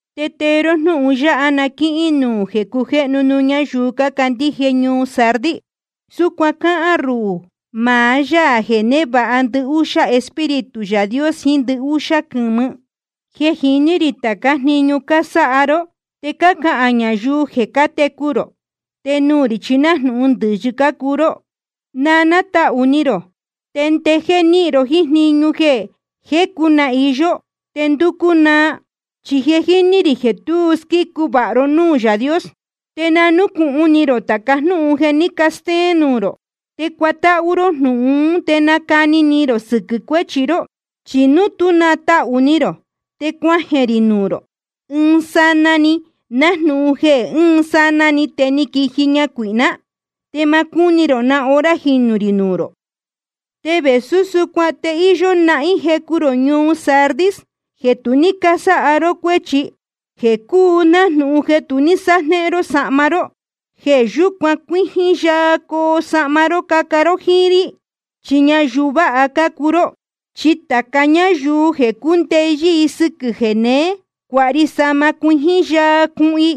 ’Te tee ró jnúhun yáha na quíhín nuū jeē cujéhnu nuū ñáyuu cácandíje ñuu Sardis: Súcuan cáhán ruhū, maá Yaā jeē névāha ndɨhúxá Espíritu Yaā Dios jiín ndɨhúxá quɨ̄mɨ. Je jíní rī tācá jniñu cásáha ró, te cácahān ñayuu jeē cátecu rō, te nuū rī chi nájnūhun ndɨ̄yɨ cácuu ró. Na nátahū ni rō, te ndejéé níhin ró jíín jniñu jeē jecu na iyó te ndúcú naa. Chi je jíní rī jeē tu squícu vāha vāha ró núū Yaā Dios. Te na núcūhun ni rō tāca jnúhun jeē ní castéén nuū rō. Te cuatáhú ró jnúhun ún te nacani ni rō sɨquɨ̄ cuéchi ró. Chi núu tú natahū ni rō, te cuajeē rī nuū rō ɨɨn sanaa‑ni nájnūhun jeē ɨɨn sanaa‑ni te quíji ñacuīhná, te ma cúni rō na hora jinū rī nuū rō. Te vēsú súcuan te íyó nahín jecu rō ñuu Sardis jeē tu ní cásáha ró cuéchi, jeē cúu nájnūhun jeē tu ní sájnéhén ró sahma ró. Jeē yúcuan cuíjín yaa coo sahma ró caca ró jíín rí, chi ñayuu vāha cácuu ró. Chi tāca ñáyuu jeē cúndeyɨ́ sɨ́quɨ̄ jeneé, cuāha ri sahma cuijín yaa cuhun i.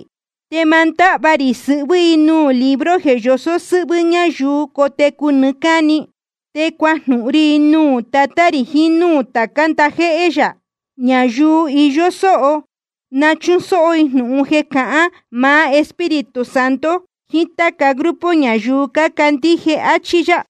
Te ma ndáhva rī sɨhvɨ́ i nuū libro jeē yosó sɨ́hvɨ́ ñáyuu cotecu nɨɨ́ cáni. Te cuajnúhún rí i nuū Tatá rī jiín núū tācá ndajéhé yā. Ñayuu iyó sóho na chúsóhó i jnūhun jeē cahán maá Espíritu Santo jiín táca grupo ñayuu cácandíje. Achí yá.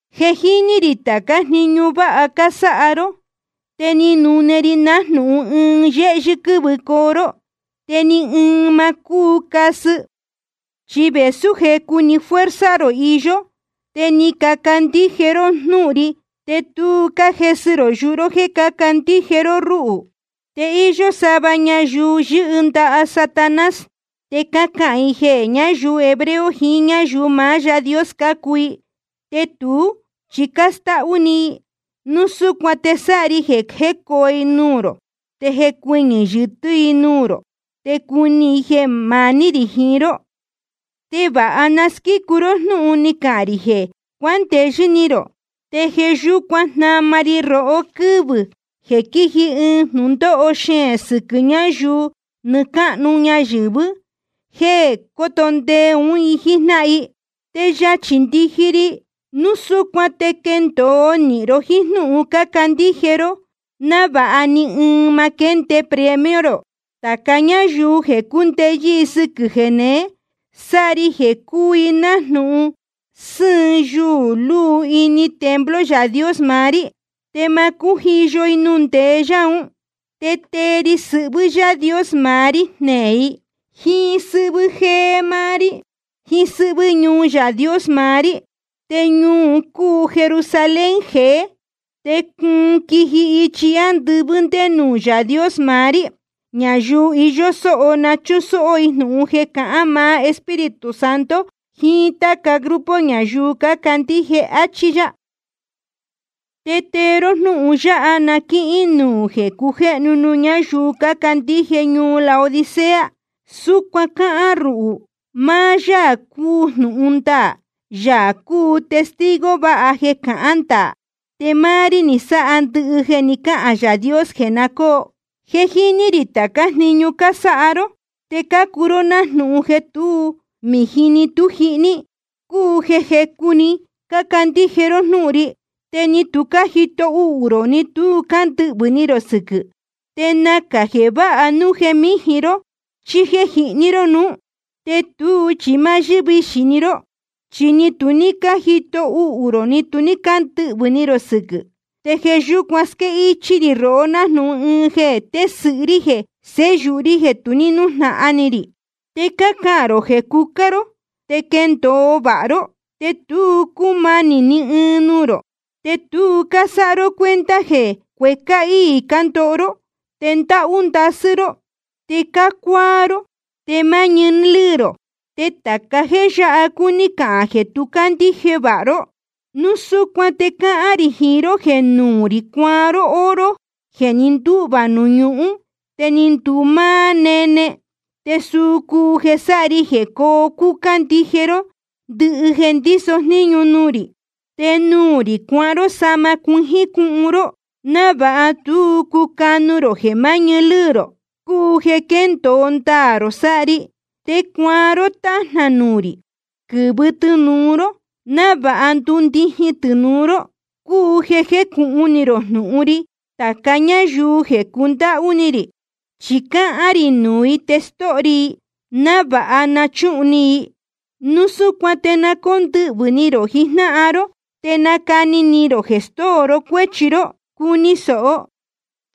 Je jíní rī tācá jniñu váha cásáha ró. Te ni nune ri nájnūhun ɨɨn yéhyɨ́ quɨ́vɨcoo ró, te ni ɨɨn ma cúu casɨ. Chi vēsú jecu‑ni fuerza rō iyó, te ni cacandíje ró jnúhun ri, te tu cájesɨ rō yuhu ró jéē cácandíje ró rúhū. Te íyó sava ñayuu yɨ́hɨ ndaha Satanás, te cácahān i jeē ñáyuu hebreo, jiín ñáyuu maá Yaā Dios cácuu i, te tuú chi cástáhú‑ni i. Núu súcuan te sáha ri jeē jécoo i nuū rō te jecuɨñɨ̄ yɨtɨ́ i nuū rō, te cuni i jeē maní rī jiín ró. Te vāha ni casquícu ró jnúhun ní cahān rī jeē cuándeyɨ́ ni rō. Te jeē yúcuan jnama ri rohó quɨ́vɨ̄ jeē quíji ɨɨn jnūndóho xeēn sɨquɨ̄ ñáyuu nɨɨ́ cáhnu ñayɨ̄vɨ́, jéē cóto ndee ún i jíjnáhan i. Te yachī ndiji ri. Núu súcuan te quendōo nīhin ró jíín jnúhun cácandíje ró, návāha ni ɨɨn ma quénde premio rō. Tāca ñáyuu jeē cúndeyɨ́ sɨ́quɨ̄ jeneé, sáha ri jeē cuu i nájnūhun sɨhɨ̄n yuū luu ini templo Yaā Dios maá rí. Te ma cújiyo i nuū ndeé yá un. Te tee ri sɨhvɨ́ Yaā Dios maá rí jneē i, jíín sɨ́hvɨ́ jéé máá rí, jíín sɨ́hvɨ́ ñuu Yaā Dios maá rí. Te ñuu un cúu Jerusalén jeé, te cuun quiji ichi ándɨvɨ́ ndé nuū Yaā Dios maá rí. Ñayuu iyó sóho na chúsóhó i jnūhun jeē cahán maá Espíritu Santo jiín táca grupo ñayuu cácandíje. Achí yá. ’Te tee ró jnúhun yáha na quíhín nuū jeē cujéhnu nuū ñáyuu cácandíje ñuu Laodicea: Súcuan cáhán ruhū, maá Yaā cúu jnūhun ndaā, Yaā cúu testigo vāha jeē cahán ndaā. Te máá rí ni sáha ndɨhɨ jeē ni cáhān Yaā Dios jeē na jécōo. Je jíní rī tācá jniñu cásáha ró. Te cácuu ró nájnūhun jeē tú mījin ni tú jihní, cúu jeē jecu‑ni cácandíje ró jnúhun ri, te ni tu cájito uhū rō ni tu cándɨhvɨ̄ ni rō sɨquɨ̄. Te nacā jeē váha núu jeē míjin ró chí jéē jihní ró nuú. Te tuú chi máá yɨ́vixī‑ni ró, chi ni tu cájito uhū rō ni tu cándɨhvɨ̄ ni rō sɨquɨ̄. Te jeē yúcuan squéhichī rī rohó nájnūhun ɨɨn jeē tésɨ̄hɨ rí jeē séyūhu rí jeē tu nújnahan ni rī. Te cácahān rō jeē cucá ró, te quéndōo vāha ró, te tu cúmanī ni ɨɨn nuū rō. Te tu cásáha ró cuenta jeē cuécá íī cándoho ró, te ndáhú ndasɨ́ ró, te cácuáá ró, te máá ñɨɨ lɨ́ɨ rō. Te tāca jéē yáha cúní cahān jeē tu cácandíje vāha ró. Núu súcuan te cáhán rī jiín ró jeē nuū rī cuaan ró oro jeē ni ndúhvā nuū ñuhún te ni nduu máá nene, te suu cúu jeē sáha ri jeē coo cúcá ndije ró ndɨhɨ jeē ndíso jnūhun ri. Te nuū rī cuaan ró sahma cuijín cuhun ró, návāha tú cucanu rō jeē maá ñɨɨ lɨ́ɨ rō, cúu jeē quéndōo ndaā rō sáha ri. Te cuaan ró tájnā nuū rī, quɨ̄vɨ tɨnūu ró, návāha ndundijin tɨnūu ró, cúu jeē jecūhun ni rō jnūhun ri. Tāca ñáyuu jeē cundáhú ni rī, chi cáhán rī nuū i te stóho ri i, návāha na chúhun ni i. Núu súcuan te na cóndɨhvɨ̄ ni rō jijnáhan ró, te nacani ni rō jeē stóo ró cuéchi ró. Cuni sōho,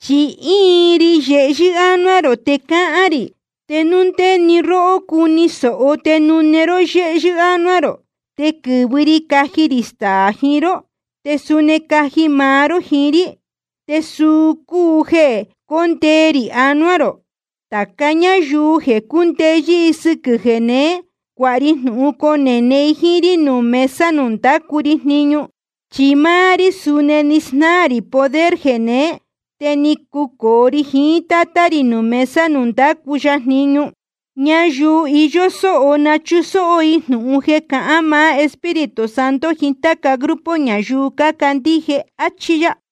chi íin ri yehyɨ́ ánuá rō te cáhán rī. Te núu ndé‑ni róhó cuni sōho te nune ró yéhyɨ́ ánuá rō, te quɨ̄vɨ ri caji rī staā jiín ró, te suni caji maá ró jiín rí. Te suu cúu jeē cóndee rī anuá rō. Tāca ñáyuu jeē cúndeyɨ́ sɨ́quɨ̄ jeneé, cuāha ri jnūhun conene i jíín rí nuū mesa nuū ndácu ri jniñu. Chi máá rí suni ni snáā rī poder jeneé, te ni cucōo ri jiín Tátá rī nuū mesa nuū ndácu ya jniñu. Ñayuu iyó sóho na chúsóhó i jnūhun jeē cahán maá Espíritu Santo jiín táca grupo ñayuu cácandíje. Achí yá.